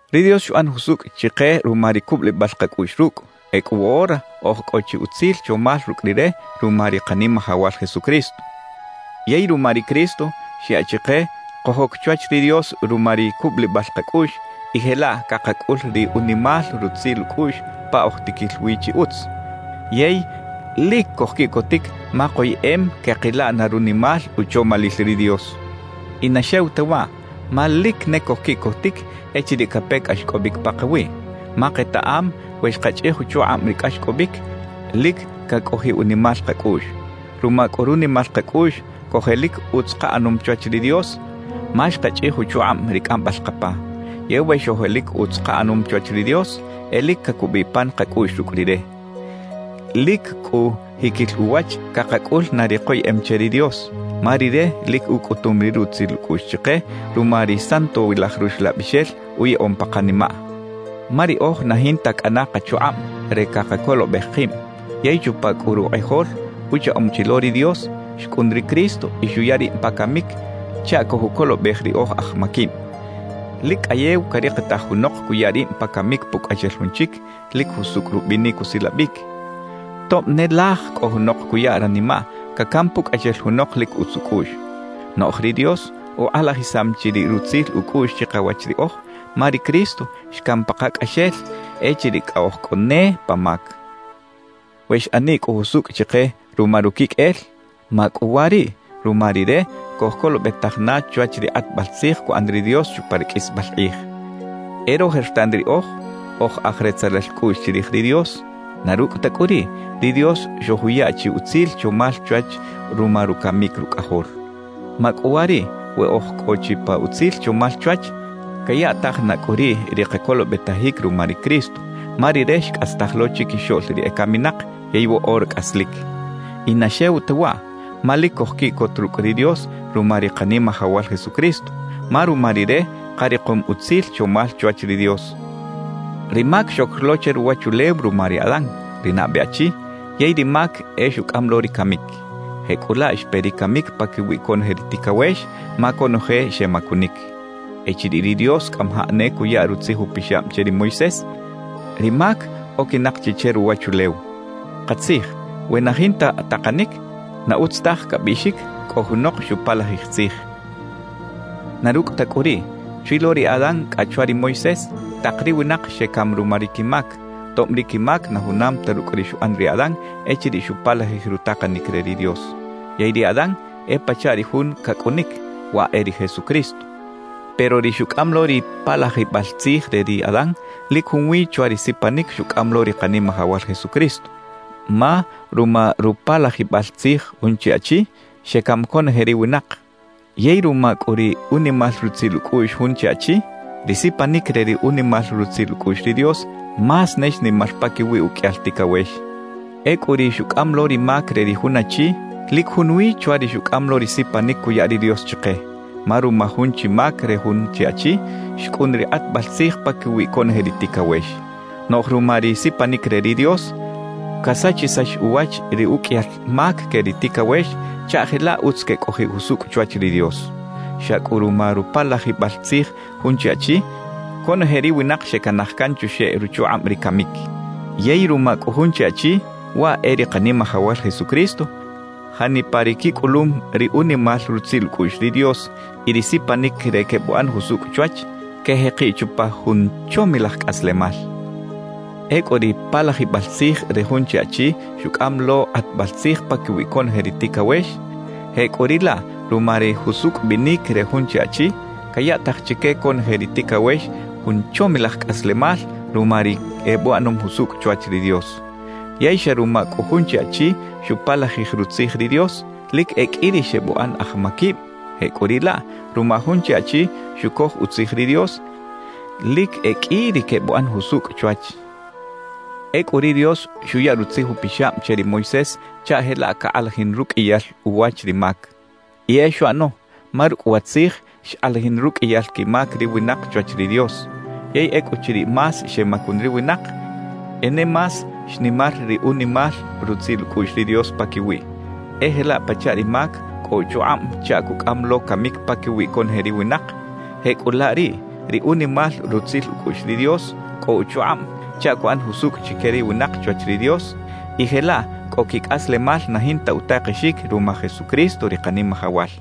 Ri Dios xuꞌan jusukꞌ chiqe ruma ri kubꞌulibꞌal qakꞌuꞌx rukꞌ; ekꞌu woꞌora oj kꞌo chi utzil chomal rukꞌ Rire ruma ri Qanimajawal Jesucristo. Yey ruma ri Cristo, xyaꞌ chiqe kojok chwach ri Dios ruma ri kubꞌulibꞌal qakꞌuꞌx y jelaꞌ kaqakꞌul ri unimal rutzil ukꞌuꞌx pa oj tikil wi chi utz. Yey lik kojkiꞌkotik ma qoyeꞌem keꞌqila na runimal uchomalil ri Dios. Y na xew ta waꞌ, ma lik ne kojkiꞌkotik echiriꞌ kape kꞌaxkꞌobꞌik paqawiꞌ. Ma qetaꞌam we xqachꞌij uchuqꞌabꞌ ri kꞌaxkꞌobꞌik, lik kakꞌojiꞌ unimal qakꞌuꞌx. Ruma kꞌu runimal qakꞌuꞌx kojelik utz qaꞌanom chwach ri Dios, ma xqachꞌij uchuqꞌabꞌ ri kꞌambꞌal qapa. Yey we xojelik utz qaꞌanom chwach ri Dios, e lik kakubꞌiꞌ pan qakꞌuꞌx rukꞌ Rire. Lik kꞌu jikil uwach kaqakꞌul na ri qoyeꞌem che ri Dios, ma Rire lik ukꞌutum ri rutzil ukꞌuꞌx chiqe ruma ri Santowilaj Ruxlabꞌixel uyaꞌom pa qanimaꞌ. Ma riꞌoj na jinta kꞌana qachuqꞌabꞌ re kaqakolobꞌej qibꞌ; yey chupa kꞌu ruqꞌijol uchaꞌom chi lo ri Dios, xkꞌun ri Cristo y xuya ribꞌ pa kamik chaꞌ kojukolobꞌej ri oj aj makibꞌ. Lik kꞌayew kariqitaj junoq kuya ribꞌ pa kamik pukꞌaxel jun chik lik jusukꞌ rubꞌinik usilabꞌik; tobꞌ ne laj kꞌo junoq kuya ranimaꞌ kakam pukꞌaxel junoq lik utz ukꞌuꞌx. Noꞌj ri Dios uqꞌalajisam chi ri rutzil ukꞌuꞌx chiqawach riꞌoj, ma ri Cristo xkam paqakꞌaxel echiriꞌ kꞌa oj kꞌo ne pa mak. We xꞌaniꞌ kꞌu jusukꞌ chiqe ruma rukikꞌel, makꞌuwariꞌ ruma Rire kojkolobꞌetaj na chwach ri qꞌatbꞌal tzij kuꞌan ri Dios chupa ri kꞌisbꞌal qꞌij. E rojertan riꞌoj oj aj retzelal kꞌuꞌx chirij ri Dios; na rukꞌ ta kꞌu riꞌ, ri Dios xojuya chi utzil chomal chwach ruma rukamik Rukꞌajol. Makꞌuwariꞌ we oj kꞌo chi pa utzil chomal chwach, kayaꞌtaj na kꞌu riꞌ ri qakolobꞌetajik ruma ri Cristo, ma Rire xkꞌastaj lo chikixoꞌl ri ekaminaq yey woꞌora kꞌaslik. Y na xew ta waꞌ, ma lik kojkiꞌkot rukꞌ ri Dios ruma ri Qanimajawal Jesucristo, ma ruma Rire qariqom utzil chomal chwach ri Dios. Ri mak xok lo che ruwachulew ruma ri Adán, ri nabꞌe achi; yey ri mak e xukꞌam lo ri kamik. Jekꞌulaꞌ xpe ri kamik pakiwi konoje ri tikawex, ma konoje xemakunik. Echiriꞌ ri Dios kꞌamajaꞌ ne kuya Rutzij Upixabꞌ che ri Moisés, ri mak okinaq chi che ruwachulew. Qatzij, we na jinta taqanik, na utz taj kabꞌiꞌxik kꞌo junoq xupalajij tzij. Na rukꞌ ta kꞌu riꞌ, chwi lo ri Adán kꞌa chwa ri Moisés, taq ri winaq xekam ruma ri kimak, tobꞌ ri kimak na junam ta rukꞌ ri xuꞌan ri Adán echiriꞌ xupalajij ri taqanik re ri Dios. Yey ri Adán e pachaꞌ ri Jun kakꞌunik, waꞌ e ri Jesucristo. Pero ri xukꞌam lo ri palajibꞌal tzij re ri Adán lik junwi chwa ri sipanik xukꞌam lo ri Qanimajawal Jesucristo. Ma ruma rupalajibꞌal tzij jun chi achi, xekam konoje ri winaq; yey ruma kꞌu ri unimal rutzil ukꞌuꞌx jun chi Achi, ri sipanik re ri unimal rutzil ukꞌuꞌx ri Dios más ne xnimar pakiwi ukꞌiyal tikawex. Ekꞌu ri xukꞌam lo ri mak re ri jun achi, lik junwi chwa ri xukꞌam lo ri sipanik kuya ri Dios chiqe. Ma ruma jun chi mak re jun chi achi, xkꞌun ri qꞌatbꞌal tzij pakiwi konoje ri tikawex. Noꞌj ruma ri sipanik re ri Dios, kasachisax uwach ri ukꞌiyal mak ke ri tikawex chaꞌ jelaꞌ utz kekꞌojiꞌ jusukꞌ chwach ri Dios. Xa kꞌu ruma rupalajibꞌal tzij jun chi achi, konoje ri winaq xekanaj kan chuxeꞌ ruchuqꞌabꞌ ri kamik. Yey ruma kꞌu jun chi Achi, waꞌ e ri Qanimajawal Jesucristo, janipa ri kikꞌulum ri unimal rutzil ukꞌuꞌx ri Dios y ri sipanik re kebꞌuꞌan jusukꞌ chwach, kejeqiꞌ chupa jun chomilaj kꞌaslemal. Ekꞌu ri palajibꞌal tzij re jun chi achi xukꞌam lo qꞌatbꞌal tzij pakiwi konoje ri tikawex, jekꞌuriꞌlaꞌ ruma ri jusukꞌ bꞌinik re jun chi Achi, kayaꞌtaj chike konoje ri tikawex jun chomilaj kꞌaslemal ruma ri ebꞌuꞌanom jusukꞌ chwach ri Dios. Yey xa ruma kꞌu jun chi achi xupalajij rutzij ri Dios, lik e kꞌi ri xebꞌuꞌan aj makibꞌ; jekꞌuriꞌlaꞌ, ruma jun chi Achi xukoj utzij ri Dios, lik e kꞌi ri kebꞌuꞌan jusukꞌ chwach. Ekꞌu ri Dios xuya Rutzij Upixabꞌ che ri Moisés chaꞌ jelaꞌ kaqꞌalajin rukꞌiyal uwach ri mak. Y e xuꞌano, ma rukꞌ wa Tzij xqꞌalajin rukꞌiyal kimak ri winaq chwach ri Dios. Yey ekꞌuchiriꞌ más xemakun ri winaq, e ne más xnimar ri unimal rutzil ukꞌuꞌx ri Dios pakiwiꞌ. E jelaꞌ pachaꞌ ri mak kꞌo uchuqꞌabꞌ chaꞌ kukꞌam lo kamik pakiwi konoje ri winaq; jekꞌulaꞌ riꞌ ri unimal rutzil ukꞌuꞌx ri Dios kꞌo uchuqꞌabꞌ chaꞌ kuꞌan jusukꞌ chike ri winaq chwach ri Dios, y jelaꞌ kꞌo kikꞌaslemal na jinta utaqexik ruma Jesucristo, ri Qanimajawal.